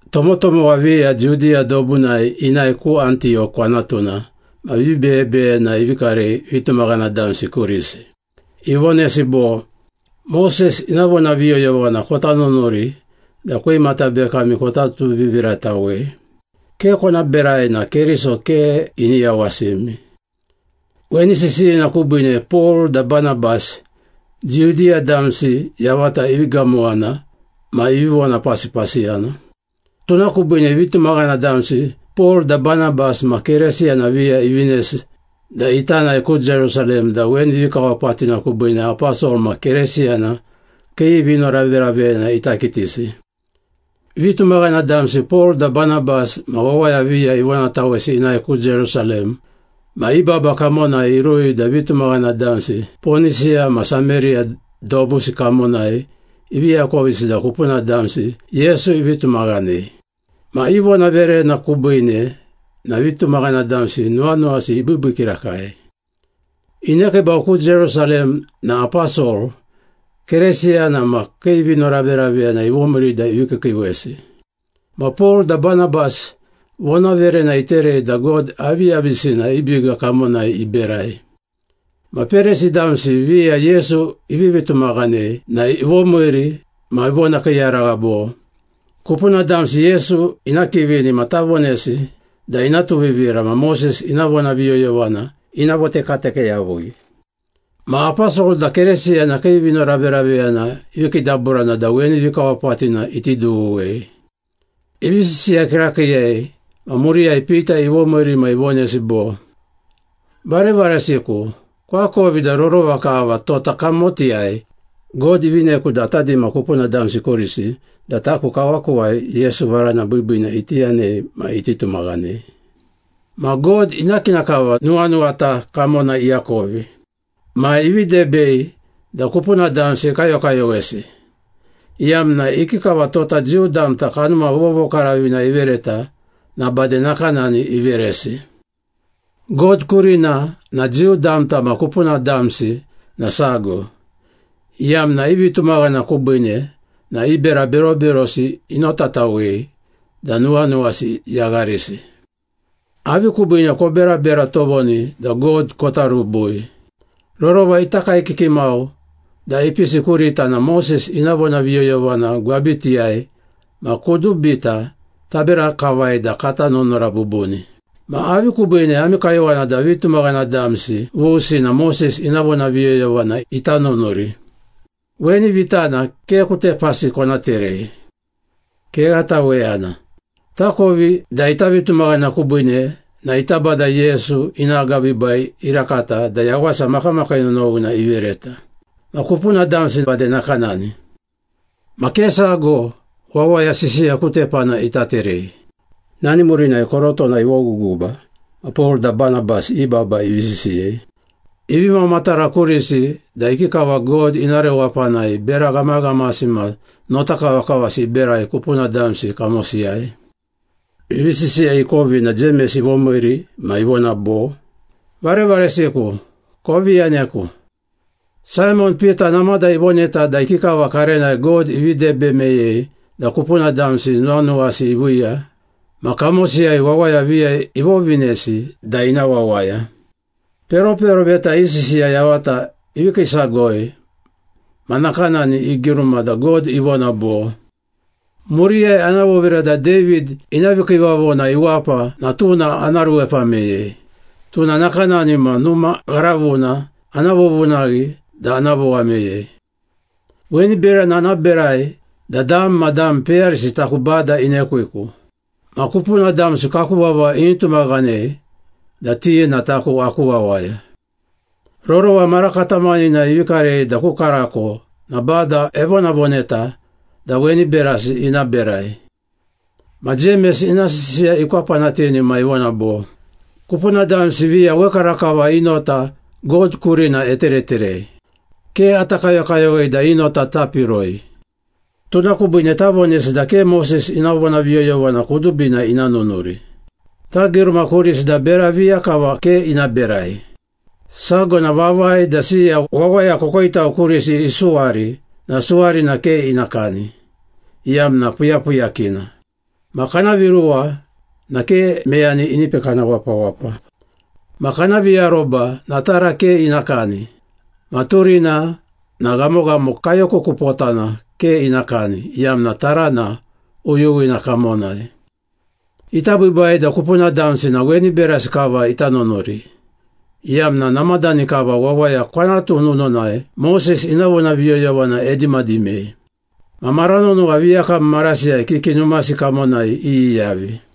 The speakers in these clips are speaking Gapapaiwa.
Tomotomowa viya Judiya dobunai inae ku Antiyok kwanatuna ma vibeyebeyena ivi karei vitumaghana damsi kurisi. Ivonesi bo, “Moses ina vonaviyoyovana kota nunuri da kwimata bekami kota tuviviratawei. Ke kona berai na Keriso ke ini yawasimi.” Weni sisiyina kubiine Pol da Banabas, Judiya damsi yavata ivi gamowana ma ivi vonapasipasiyana. Tuna kubiine vitumaghana damsi Pol da Banabas ma Keresiyana viya ivinesi da ita nae ku Jerusalem da weni vikawapatina kubiine aposol ma Keresiyana kii vinoraveraveyana ita kitisi. Vitumaghana damsi Pol da Banabas ma wawaya viya ivonatawesi inae ku Jerusalem ma i baba kamonai irui da vitumaghana damsi Ponisiya ma Sameriya dobusi kamonai ivi akovisi da kupuna damsi Yesu ivi tumaghanei. Ma i vonaverena kubiine na vitumaghana damsi nuwanuwasi ibiibii kirakai. Inekiibau ku Jerusalem na aposol, Keresiyana ma kii vinoraveraveyana ivomiiri da ivi kiikiiwesi. Ma Pol da Banabas vonaverena iterei da God aviyavisina i biga kamonai iberai. Ma Perisi damsi viya Yesu ivivi tumaghanei na ivomiiri ma ivonakiiyaragha bo, “Kupuna damsi Yesu ina kivini na tavonesi da ina tuvivira ma Moses ina vonaviyoyovana ina votekateke yavui.” Ma aposol da Keresiyana kii vinoraveraveyana ivi kiidaburana da weni vikawapatina iti dughuwei. Ivi sisiya kirakiiyei ma muriyai Pita ivomiiri ma ivonesi bo, “Varevaresiku, koakovi da rorova kava tota kamotiyai God ivineku da ata dima kupuna damsi kurisi da taku kawakuwai Yesu varana biibiina iti yanei ma iti tumaghanei. Ma God, ina kina kava nuwanuwata kamona iakovi. Ma ivi debei da kupuna damsi ekayokayowesi, iyamna ikikava tota Jiu damta Kanuma Vovokaravina ivereta na bade nakanani iveresi. God kurina na Jiu damta ma kupuna damsi na sago, iyamna i vitumaghana kubiine na i bera beroberosi inotatawei da nuwanuwasi yagharisi. Avi kubiine koberabera tovoni da God kota rubui? Rorova ita kaekiki mau da ipisi kurita na Moses ina vonaviyoyovana gwabitiyai ma kudubita tabera kavai da kata nunura bubuni. Ma avi kubiine ami kayowana da vitumaghana damsi vusi na Moses ina vonaviyoyovana ita nunuri? Weni vitana ke ku tepasi kona terei. Kegha taweyana! Takovi da ita vitumaghana kubiine na ita Bada Yesu ina agabiibai irakata da yawasa makamakii nonowina ivereta. Ma kupuna damsi bade nakanani.” Ma ke sago wawaya sisiya ku tepana ita terei. Nani murinai korotona ivoguguba ma Pol da Banabas i baba ivi sisiyei. Ivi mamatara kurisi da ikikava God ina rewapanai bera ghamaghamasi ma notakavakavasi iberai kupuna damsi kamosiyai. Ivi sisiya ikovi na Jemes ivomiiri ma ivona bo, “Varevaresiku, kovi yaneku. Saimon Pita namada ivoneta da ikikava karenai God ivi debe meyei da kupuna damsi nuwanuwasi iviiya ma kamosiyai wawaya viya ivovinesi da ina wawaya. Peroperoveta i sisiya yavata ivi kiisagoi ma nakanani igiruma da God ivona bo, ‘Muriyai ana vovira da David ina vikiivavona iwapa na tuna ana ruepa meyei, tuna nakanani ma numa gharavuna ana vovunaghi da ana vowa meyei. Weni berana ana berai da dam ma dam peyarisi taku Bada inekwiku. Ma kupuna damsi kaku vava ini tumaghanei da ti na taku aku wawaya. Rorova mara katamaninai ivi karei da ku karako na Bada evonavoneta da weni berasi ina berai.’” Ma Jemes ina sisiya ikwapanatini ma ivona bo, “Kupuna damsi viya wekarakava i nota God kurina etereterei. Ke ata kayokayowei da i nota tapiroi. Tuna kubiine tavonesi da ke Moses ina vonaviyoyovana kudubina ina nunuri. Tagiruma kurisi da bera viya kava ke ina berai. Sago na vavai da siya wawaya kokoitau kurisi isuwari na suwarina ke ina kani, iyamna puyapuyakina. Ma kana viruwa na ke meyani ini pekana wapawapa. Ma kana viaroba na tara ke ina kani ma turina na ghamoghamo kayo kukupotana ke ina kani, iyamna tarana uyuwina kamonai. Ita biibai da kupuna damsi na weni berasi kava ita nunuri, iyamna namadani kava wawaya kwanatu nununai Moses ina vonaviyoyovana edimadimei. Ma mara nonowa viyakam marasiyai kiki numasi kamonai iyiyavi.”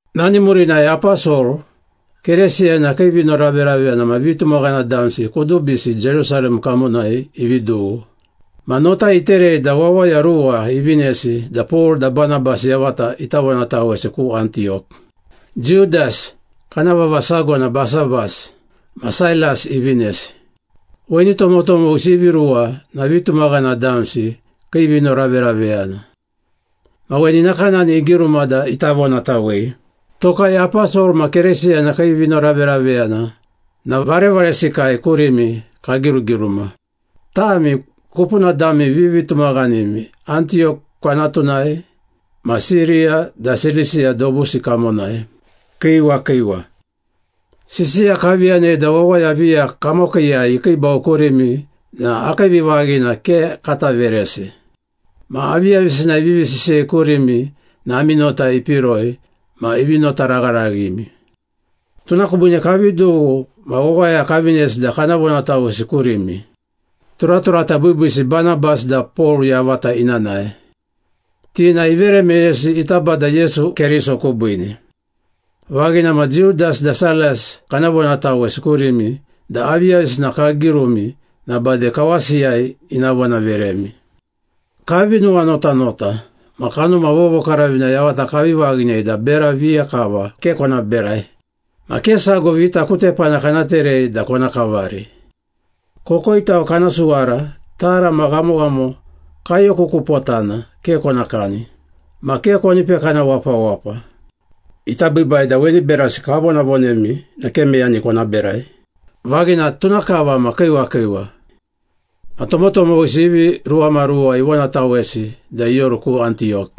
Nani murinai aposol, Keresiyana kii vinoraveraveyana ma vitumaghana damsi kudubisi Jerusalem kamonai ivi dughu. Ma nota iterei da wawaya ruwa ivinesi da Pol da Banabas yavata ita vonatawesi ku Antiyok. Judas (kana vava sago na Basabas) ma Sailas ivinesi. Weni tomotomowisi ivi ruwa na vitumaghana damsi kii vinoraveraveyana. Ma weni nakanani igiruma da ita vonatawei, “Tokai aposol ma Keresiyana kii vinoraveraveyana na varevaresikai kurimi kagirugiruma. Tami, kupuna dami vivitumaghanimi Antiyok kwanatunai, ma Siriya da Silisiya dobusi kamonai. Kiiwa kiiwa. Sisiya kavi yanei da wawaya viya kamokiiyai ikiibau kurimi na akii vivaghina ke kata veresi. Ma aviyavisina ivivi sisiyei kurimi na ami nota ipiroi ma ivi notaragharaghimi. Tuna kubiine kavi dughu ma wawaya kavinesi da kana vonatawesi kurimi, turaturata biibiisi Banabas da Pol yavata ina nae. Ti na ivere meyesi ita Bada Yesu Keriso kubiine. Vaghina ma Judas da Sailas kana vonatawesi kurimi da aviyavisina kagirumi na bade kawasiyai ina vonaveremi. Kavi nuwanotanota ma Kanuma Vovokaravina yavata kavi vaghinei da bera viya kava ke kona berai. Ma ke sago vita ku tepana kana terei da kona kavari. Kokoitau kana suwara, tara ma ghamoghamo kayo kukupotana ke kona kani, ma ke koni pekana wapawapa. Ita biibai da weni berasi kavonavonemi na ke meyani kona berai. Vaghina, tuna kava ma kiiwa kiiwa.” Ma tomotomowisi ivi ruwamaruwa ivonatawesi da ioru ku Antiyok.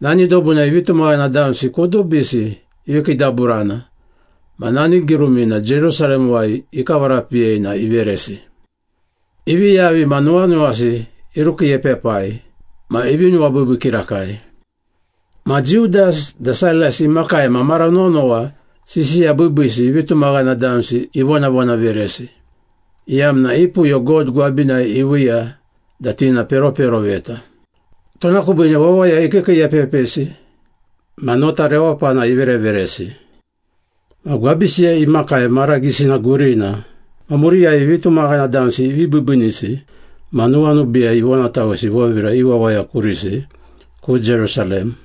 Nani dobunai vitumaghana damsi kudubisi ivi kiidaburana ma nani girumina Jerusalemuwai ikavarapiyei na iveresi. Ivi yavi ma nuwanuwasi irukiiepepai ma ivi nuwabiibii kirakai. Ma Judas da Sailas imakai ma mara nonowa sisiya biibiisi vitumaghana damsi ivonavonaveresi, iyamna i puyo God gwabinai iviiya da ti na peroperoveta. Tuna kubiine wawaya ikiikiiepepisi ma nota rewapana ivereveresi. Ma gwabisiyai imakai mara gisina gurina ma muriyai vitumaghana damsi ivi biibiinisi ma nuwanubiiyai ivonatawesi ivovira i wawaya kurisi, ku Jerusalem.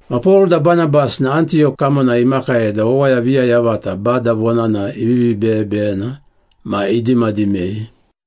Ma Pol da Banabas na Antiyok kamonai imakai da wawaya viya yavata Bada Vonana ivivi beyebeyena ma idimadimei.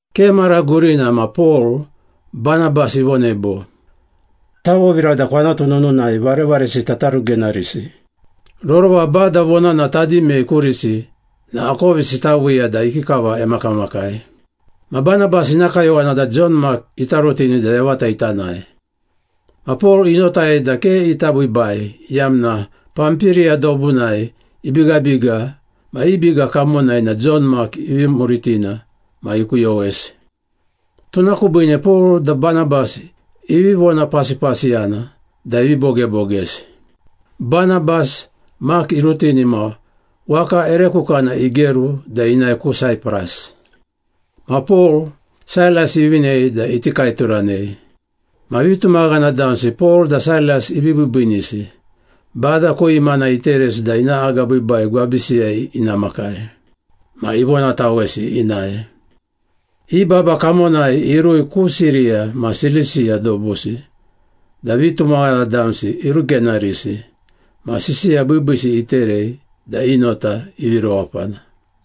Ke mara gurina ma Pol, Banabas ivonei bo, “Tavovira da kwanatu nununai varevaresita tarugenarisi. Rorova Bada Vonana tadimei kurisi na akovisi taviiya da ikikava emakamakai.” Ma Banabas ina kayowana da Jon Mak ita rutini da yavata ita nae. Ma Pol inotai da ke ita biibai, iyamna Pampiriya dobunai ibigabiga ma i biga kamonai na Jon Mak ivi muritina ma ikuyowesi. Tuna kubiine Pol da Banabas ivi vonapasipasiyana da ivi bogebogesi. Banabas, Mak irutini ma waka ere kukana igeru da inae ku Saipras. Ma Pol, Sailas ivinei da iti kaeturanei. Ma vitumaghana damsi Pol da Sailas ivi biibiinisi, Bada ku imana iteresi da ina agabiibai gwabisiyai ina makai. Ma ivonatawesi inae. I baba kamonai irui ku Siriya ma Silisiya dobusi da vitumaghana damsi irugenarisi ma sisiya biibiisi iterei da i nota ivi rewapana.